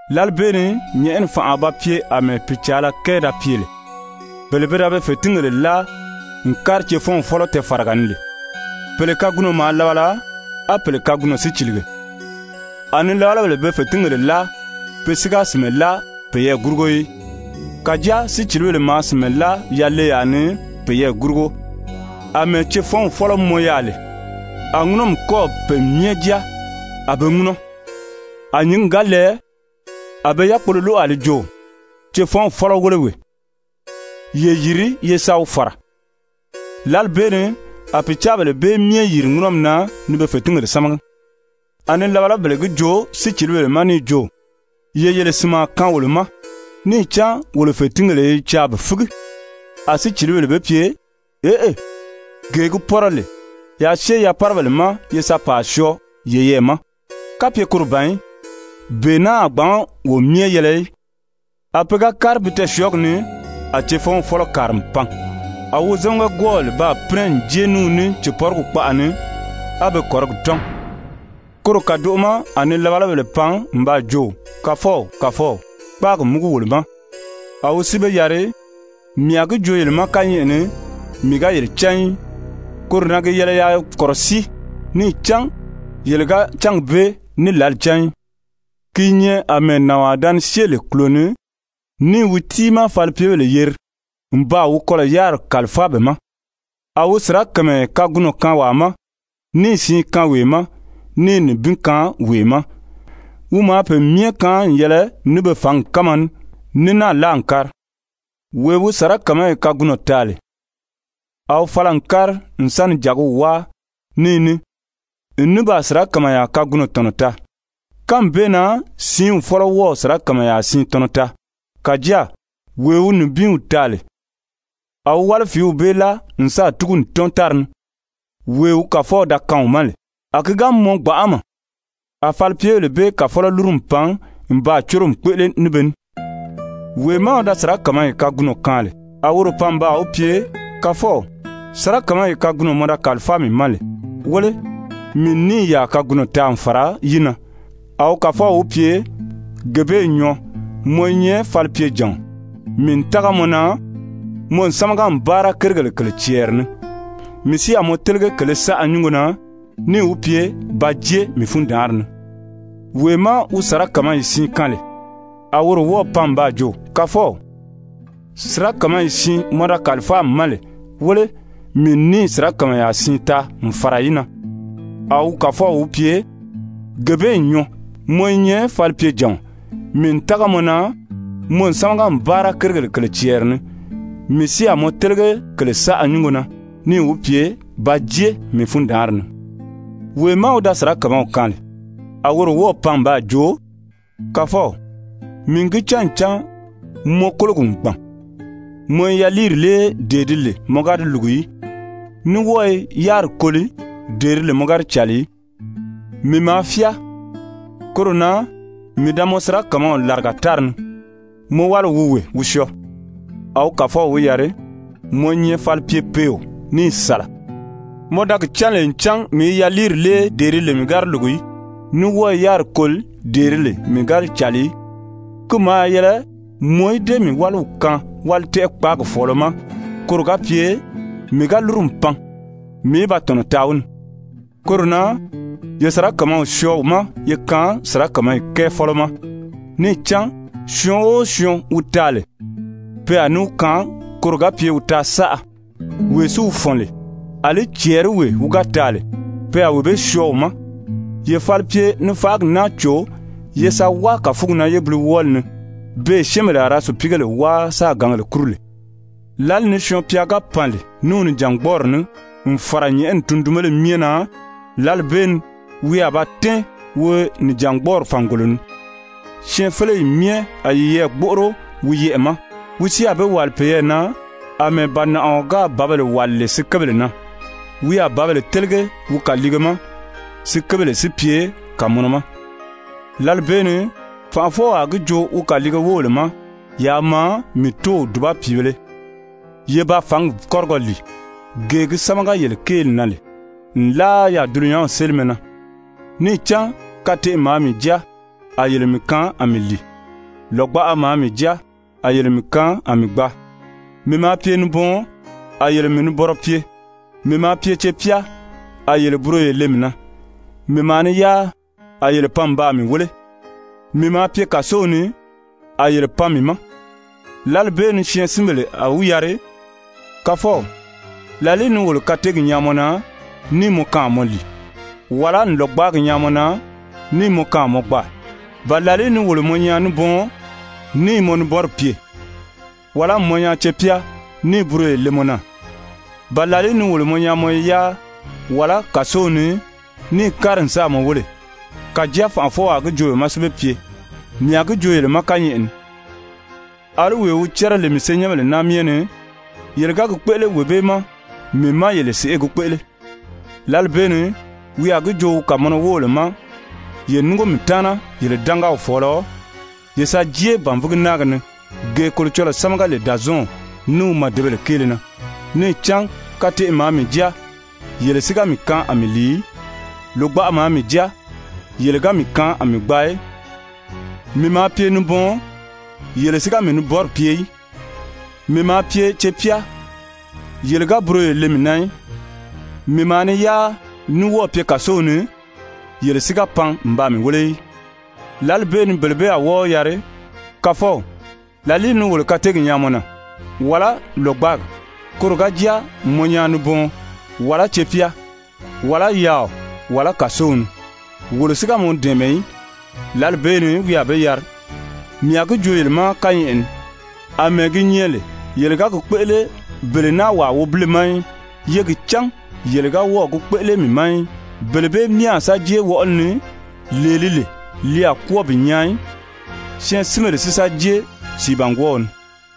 «Lǎli bee ni nyɛ̀ʔɛni fànʔa a ba pye àmɛɛ pìcaala kɛɛ da pye lè, bele pe da be fètingèle láa n kári cefɔɔn fɔ́lɔ tɛɛfaraga ni lè. Pèle kagunɔ maa labala, á pèle kagunɔ si cìlige. A nilabalabèle be fètingèle láa, pe si ga sìnmɛ láa peyɛɛ gurugo í. Kàjáa sícilibèle maa sìnmɛ láa yaleyaa ni peyɛɛ gurugo. Amɛɛ cefɔnw fɔ́lɔ mɔn yaà lè, a ŋúnɔmi kɔ́ɔ̀ pe myɛ jáa, a be i ŋúnɔ. A nyǐngi ga lɛɛ, a be yákpolo lóʔo a li jo: ‹Cefɔnw fɔ́lɔ wéle wee, ye yiri ye sa wi fàra!› Lǎli bee ni a pìcaabèle bee myɛ yìri ŋúnɔmi na ni be fètingèle sámagi. A nilabalabèle gi joo sícilibèle ma níì jo: ‹Ye yele sìnmaa kaan wolo ma, níì cán wolo fètingèle i caa bi fígi.› A sícilibèle be pye: ‹Eʔe, gee gi pɔ́rɔ lè, yaa syée yapárabèle ma ye sa pàa syɔɔ yeyɛɛ ma, kapye koro ban í, bee naa a gbǎn wo myɛ yɛlɛ í.› A pe ga kári bi tɛɛsyɔɔgi ni, a cefɔnw fɔ́lɔ kàri n pan a wozamaga-gwɔ́ɔbèle baa pínɛ n jée ní wi ní cèpɔrigi kpaʔa ni, á be kɔ̀rigi tɔ́n. Koro kàdoʔo ma a nilabalabèle pan n baa jo: ‹Kàfɔw, kàfɔw, kpáagi múgu wolo ma.› A wi si be yari: ‹Mii a gi joo yele ma kányɛʔɛ ni, mii ga yele cán í.› Koro na gi yɛlɛ yaa kɔ̀rɔsíi níì cán yele ga cángi bee ní lǎli cán í. «Ki i nyɛ àmɛɛ nànwaa da ni syée lè kùlo ni níì wi tiimaa falipyebèle yeri n baa wi kɔlɔ̀ yáriri kàlifáa be ma. A wi sirakamayɛ kagunɔ kaan wàa ma, níì siin kaan wee ma, níì nibin kaan wee ma, wi maa pe myɛ kaan n yɛlɛ ní be fǎngi kánma ní, ní náà láa n kári. Wee wi sirakamayi kagunɔ taa lè, a wi fala n kári n sa ni jàgiw wáa ní yi ní n ní baa sirakamayaa kagunɔ tɔ̀nɔ taa. Kánmi bee na siinw fɔ́lɔ wɔ́ɔ̀ sirakamayaa siin tɔnɔ taa. Kàjáa wee wi nibinw taa lè, a wi wálifiiw bee láa n sáà túgu n tɔ́n tári ni, wee wi kàfɔw da kaan wi ma lè. A ki ga mɔn gbanʔama, a falipyebèle bee kàfɔlɔ lúru n pan n baa córomi kpéʔele ní be ní. Wee má wi da sirakamayi kagunɔ kaan lè, a woro pan n baa wi pye: ‹Kàfɔw, sirakamayi kagunɔ mɔ da kàlifáa mii ma lè, wéle, mii n níì yàa kagunɔ taa n fàra yi na.› A wi kàfɔw wi pye: ‹Gee bee n nyɔɔ. Mɔ i nyɛ falipyejàɔn, mii n tága mɔ na, mɔ n sámaga n báara kérigèle kèle cɛɛri ni, mii si a mɔ télege kèle saʔa nyúngo na.› Níì wi pye: ‹Ba jée mii fundaanri ni.› Wee má wi da sirakamayi siin kaan lè, a woro wɔ́ɔ̀ pan n baa jo: ‹Kàfɔw, sirakamayi siin mɔ da kàlifáa mii ma lè, wéle, mii n níì sirakamayaa siin taa n fàra yi na.› A wi kàfɔw wi pye: ‹Gee bee n nyɔɔ. Mɔ i nyɛ falipyejàɔn, mii n tága mɔ na, mɔ n sámaga n báara kérigèle kèle cɛɛri ni, mii si a mɔ télege kèle saʔa nyúngo na.› Níì wi pye: ‹Ba jée mii fundaanri ni.› Wee má wi da sirakamaw kaan lè, a woro wɔ́ɔ̀ pan n baa jo: ‹Kàfɔw, mii n gi cán ncan mɔ kólogi n gbàn, mɔ i yaliiri lée dee di lè mɔ ga di lùgu í, ní wɔ́ɔ i yáriri koli dee di lè mɔ ga di càli í. Mii maa fyáa, koro na mii da mɔ sirakamaw làriga tári ni. Mɔ wáliw wi wee, wi syɔɔ.› A wi kàfɔw wi yari: ‹Mɔ i nyɛ falipyepeeo níì sàla, mɔ da gi cán lè ncan mii i yaliiri lée dee di lè mii ga di lùgu í, ní wɔ́ɔ i yáriri koli dee di lè mii ga di càli í, ki maa yɛlɛ mɔ í dée mii wáliw kaan wálitɛʔɛ-kpaagi fɔ̀ɔlɔ ma, koro ga pye mii ga lúru n pan, mii í ba tɔ̀nɔ taa wi ni. Koro na ye sirakamaw syɔɔ wi ma ye kaan sirakamayi kɛɛ fɔ́lɔ ma. Níì cán syɔɔn o syɔɔn wi taa lè, pe a ní wi kaan koro ga pye wi taa saʔa, wee si wi fɔ̀n lè, àlí cɛɛriwee wi ga taa lè, pe a wee bee syɔɔ wi ma. Ye falipye-nifaʔagi naa cò ye sa wáa kàfugi na yébiliwɔɔli ni, beè syɛ́ɛnbèle a ra sùpiigèle wáa sáā gǎngèle kúru lè.› «Lǎli ni Syɔɔn-pya ga pan lè ní wi nìjangbɔɔri ní n fàra nyɛ̀ʔɛni tundunbéle myɛ na, lǎli bee ni wi a ba tɛ́ɛn wi nìjangbɔɔri fàngolo ni. Syɛɛnfeleyi myɛ a yiyɛɛ gbóʔoro wi yɛʔɛ̀ ma. Wi si a be wàli peyɛɛ na àmɛɛ bànaʔaɔ gáà bǎbèle wàli lè sikebèle na. Wi a bǎbèle télege wi kàliige ma, sikebèle si pye kàmɔnɔ ma. Lǎli bee ni fànʔafɔw a gi joo wi kàliige wóbèle ma: ‹Yaa maa, mii Tóow dùba pìibēle, ye ba fǎngi kɔ́rigɔ lìi, gee gi sámaga yele kéeli na lè nlaa yaà dulunyanw sélimɛ na. Níì cán kateʔe maa mii jáa, a yele mii kaan a mii lìi. Lògbaʔa maa mii jáa, a yele mii kaan a mii gbaa. Mii maa pye nibɔɔn, a yele mii nibɔnrɔ pye. Mii maa pye cepyá, a yele buroyo le mii na. Mii maa ni yáa, a yele pan n baa mii wéle. Mii maa pye kàsow ni, a yele pan mii ma.› Lǎli bee ni syɛɛnsinbèle a wi yari: ‹Kàfɔw, làlìí ni wolo kateegi nyaa mɔ na, níì mɔ kaan a mɔ lìi, wàlá n lògbaagi nyaa mɔ na níì mɔ kaan a mɔ gbaa? Ba làlìí ni wolo mɔ nyaa nibɔɔn, níì mɔ nibɔnri pye? Wàlá n mɔ nyaa cepyá níì buroyo le mɔ na? Ba làlìí ni wolo mɔ nyaa mɔ i yáa, wàlá kàsow ni, níì kári n sáà mɔ wéle?› Kàjáa fànʔafɔw a gi joo be ma si be pye: ‹Mii a gi joo yele ma kányɛʔɛ ni, àlí wee wi cɛ́rɛ lè mii senyɛnbèle naa myɛ ni, yele ga gi kpéʔele wee bee ma, mii má yele sèʔê gi kpéʔele.› Lǎli bee ni wi a gi joo wi kàmɔnɔ wóbèle ma: ‹Ye núngo mii taana yele dángaw fɔ̀ɔlɔ, ye sa jée bànvigi náagi ni, gee Kolocɔlɔɔ sámaga lè Dàzɔɔnw ní wi màdebèle kéele na. Níì cán kateʔe maa mii jáa, yele si ga mii kaan a mii lìi í. Lògbaʔa maa mii jáa, yele ga mii kaan a mii gbaa í. Mii maa pye nibɔɔn, yele si ga mii nibɔnri pye í. Mii maa pye cepyá yele ga buroyo le mii na í. Mii maa ni yáa ní wɔ́ɔ̀ pye kàsow ni, yele si ga pan n baa mii wéle í.› Lǎli bee ni bele bee a wɔ́ɔ wi yari: ‹Kàfɔw, làlìí ni wolo kateegi nyaa mɔ na, wàlá lògbaagi, koro ga jáa n mɔ nyaa nibɔɔn, wàlá cepyá, wàlá yaaɔ, wàlá kàsow ni, wolo si ga mɔ dɛ̀ɛmɛ í?› Lǎli bee ni wi a be yari: ‹Mii a gi joo yele ma kányɛʔɛ ni, àmɛɛ gi nyɛ lè, yele ga gi kpéʔele bele naa wàa wobile ma í, ye gi cán yele ga wɔ́ɔ̀ gi kpéʔele mii ma í.› Bele bee myɛ a sa jée wɔʔɔli ni, lee li lè, li a kwɔ́ɔ bi nyaa í, syɛɛnsinbèle si sa jée sìibangwɔɔw ni.»